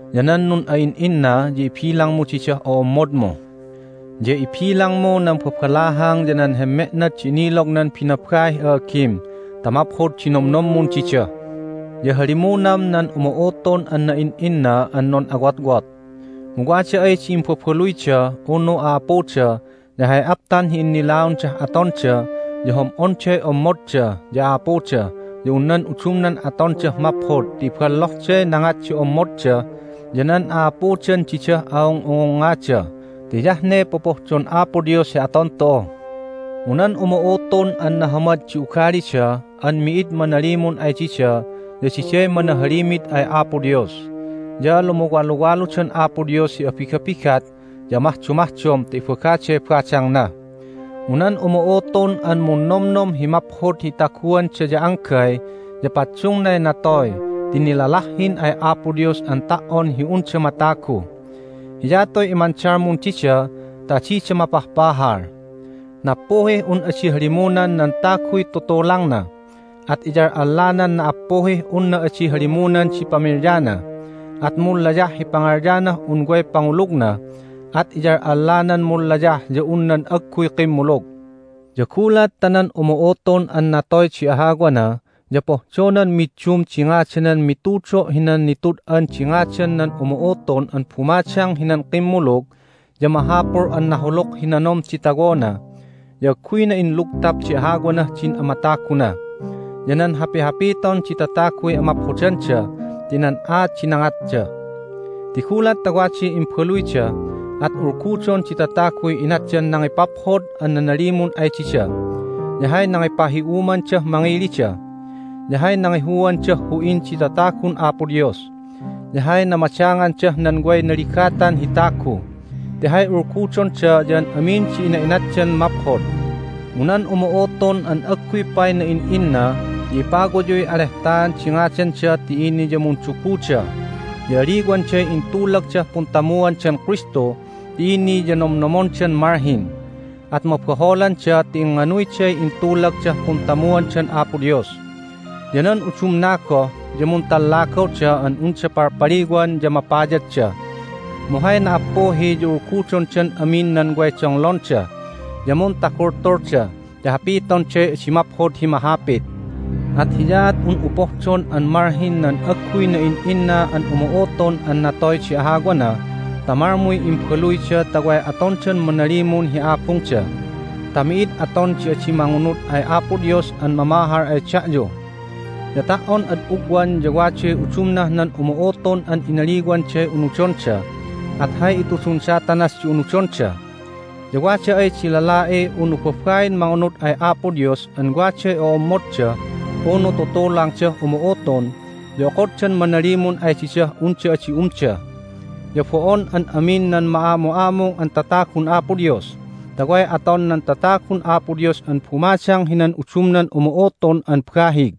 Ya nan nun'a'in'inna ya ibilangmu didah o'ommodmu. Ya ibilangmu nan babalahang ya nan hemme'nad di inilognan binabaih a'agim ta maphod di nomnommun dida. Ya halimunam nan umu'utun an na'in'inna an nun'awotwot. Mu wada ay di imbabaluyda unu a'apuda ya hay aptan hi innilaondah atonda ya hom'onday ommodda ya a'apuda ya un nan udumnan atondah maphod ti iballohday nangat di ommodda ya nan a'apudan didah a'ung'ungungngada ti hiyah ne popohdon Apo Dios hi aton tu'u. Mu nan umu'utun an nahamad di ugalida an mi'id manalimun ay dida ya diday manahalimid ay Apo Dios, ya lumuwaluwaludan Apo Dios hi abigabigat ya amahdomahdom ta ibagaday badangna. Mu nan umu'utun an munnomnom hi maphod hi itaguanda ya anggay ya paddungnay natoy ti nilalahhin ay Apo Dios an ta"on hi unda matagu. Hiyatuy imandalmun dida ta adida mapahpahal. Nappuhih un adi halimunan nan taguy tutulangna, at iyal'allanan na"appuhih unna adi halimunan di pamilyana, at munlayah hi pangalyanah un way pangulugna, at iyal'allanan munlayah ya un nan agguy kimmulug. Ya gulat ta nan umu'utun an natoy di ahawana ya pohdonan middum di ngadanan mitudo' hinan Nitud'an di Ngadan nan Umu'utun an Bumadang hinan Kimmulug ya mahapul an nahuluk hi nanom di tawona, ya agguyna inlugtap di ahawanah din amataguna, ya nan hapihapiton di tataguy amaphodanda ti nan aat di nangatda. Ti gulat ta waday imbaluyda at ulgudon di tataguy inatdan nangipaphod an nanalimun ay dida, ya hay nangipahi'umandah mangilida, ya hay nangihuandah hu'in di tatagun Apo Dios, ya hay namadangandah nan way naligatan hi tagu, ti hay ulgudonda ya an amin di ina'inatdan maphod. Mu nan umu'utun an agguy pay na'in'inna ya ipawayuy alehtaan di ngadanda ti ini ya munduguda, ya aliwanday intulagdah puntamuandan Kristu ti ini ya nomnomondan malhin, at mabaholanda ti ingnganuyday intulagdah puntamuandan Apo Dios. Ya nan udumna goh ya muntallagawda an unda palpaliwan ya mapayadda. Mu hay na"appuhi ya ulgudondan amin nan way donglonda, ya muntagultulda ti hapitonday adi maphod hi mahapit. At hiyaat un'u pohdon an malhin nan agguy na'in'inna an umu'utun an natoy di ahawana ta malmuy imbaluyda ta way atondan manalimun hi abungda, ta mi'id aton di adi mangunud ay Apo Dios an mamahal ay da'yu. Ya ta"on ad ugwan ya waday udumnah nan umu'utun an inaliwanday unudonda, at hay itudun Satanas di unudonda. Ya wada ay di lala'i unu babain mangunud ay Apo Dios an waday o'ommodda unu tutulangdah umu'utun ya okoddan manalimun ay didah unda adi umda, ya bo'on an amin nan ma'amu'amung an tatagun Apo Dios, ta way aton nan tatagun Apo Dios an bumadang hinan udumnan umu'utun an bahig.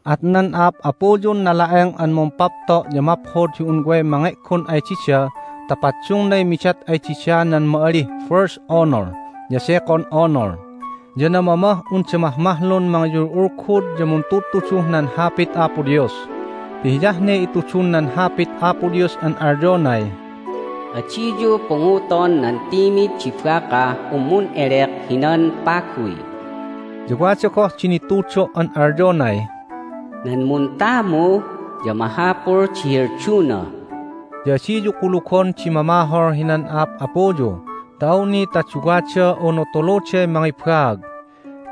At nan a'ap'apuyun nala'eng an mumpapto' ya maphod hi un way mange'gon ay dida ta paddungnay midat ay dida nan ma'alih First Honor ya Second Honor, ya namamah unda mahmahlun mangiyul'ulgud ya muntudtuduh nan Hapit Apo Dios. Ti hiyah ne itudun nan Hapit Apo Dios an alyonay, "Adiyu punguton nan timid di bakah un mun'elek hinan paguy." Ya wada goh di nitudo' an alyonay, "Nan muntamu ya mahapul di helduna." Ya adiyu kulugon di mamahol hinan a'ap'apuyu ta awni ta duwada unu tuluday mangibaag.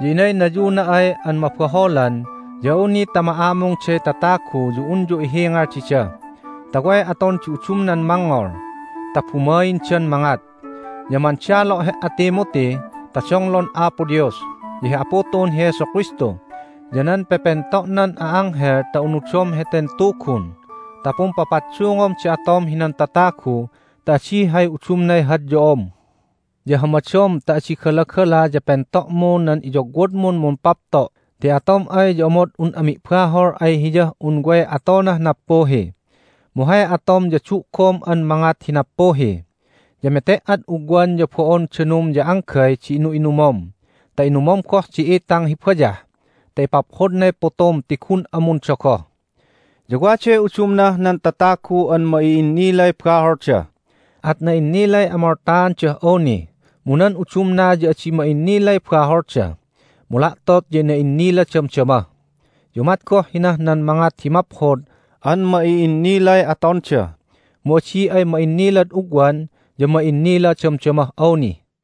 Ya inaynayuna ay an mabaholan ya awni ta ma'amungday tatagu ya unyu ihingal dida, ta way aton di udumnan mangngol, ta bumaindan mangat. Ya mandalo' he"a, Timothy, ta donglon Apo Dios, ya hi Apu tu'un hi Jesu Kristu, ya nan pepento'nan a'anghel ta unudom heten Tugun, ta pumpapaddungom di atom hinan tatagu ta adi hay udumnay hadyo'om. Ya hamadom ta adi galagala ya pento'mu nan iyogwodmun mumpapto' ti atom ay ya omod un'a mi'bahol ay hiyah un way atonah nappuhi. Mu hay atom ya du'gom an mangat hi nappuhi. Ya mete"ad ugwan ya bo'on danum ya anggay di inu'inumom ta inumom goh di itang hi bayah ta ipaphodnay putum ti gun'a mundogoh. Ya waday udumnah nan tatagu an ma'i'innilay baholda, at na'innilay amoltaandah awni, mu nan udumna ya adi ma'innilay baholda, mu la'tot ya na'innila damdama. Ya umat goh hinah nan mangat hi maphod an ma'i'innilay atonda, mu adi ay ma'innilad ugwan ya ma'innila damdamah awni.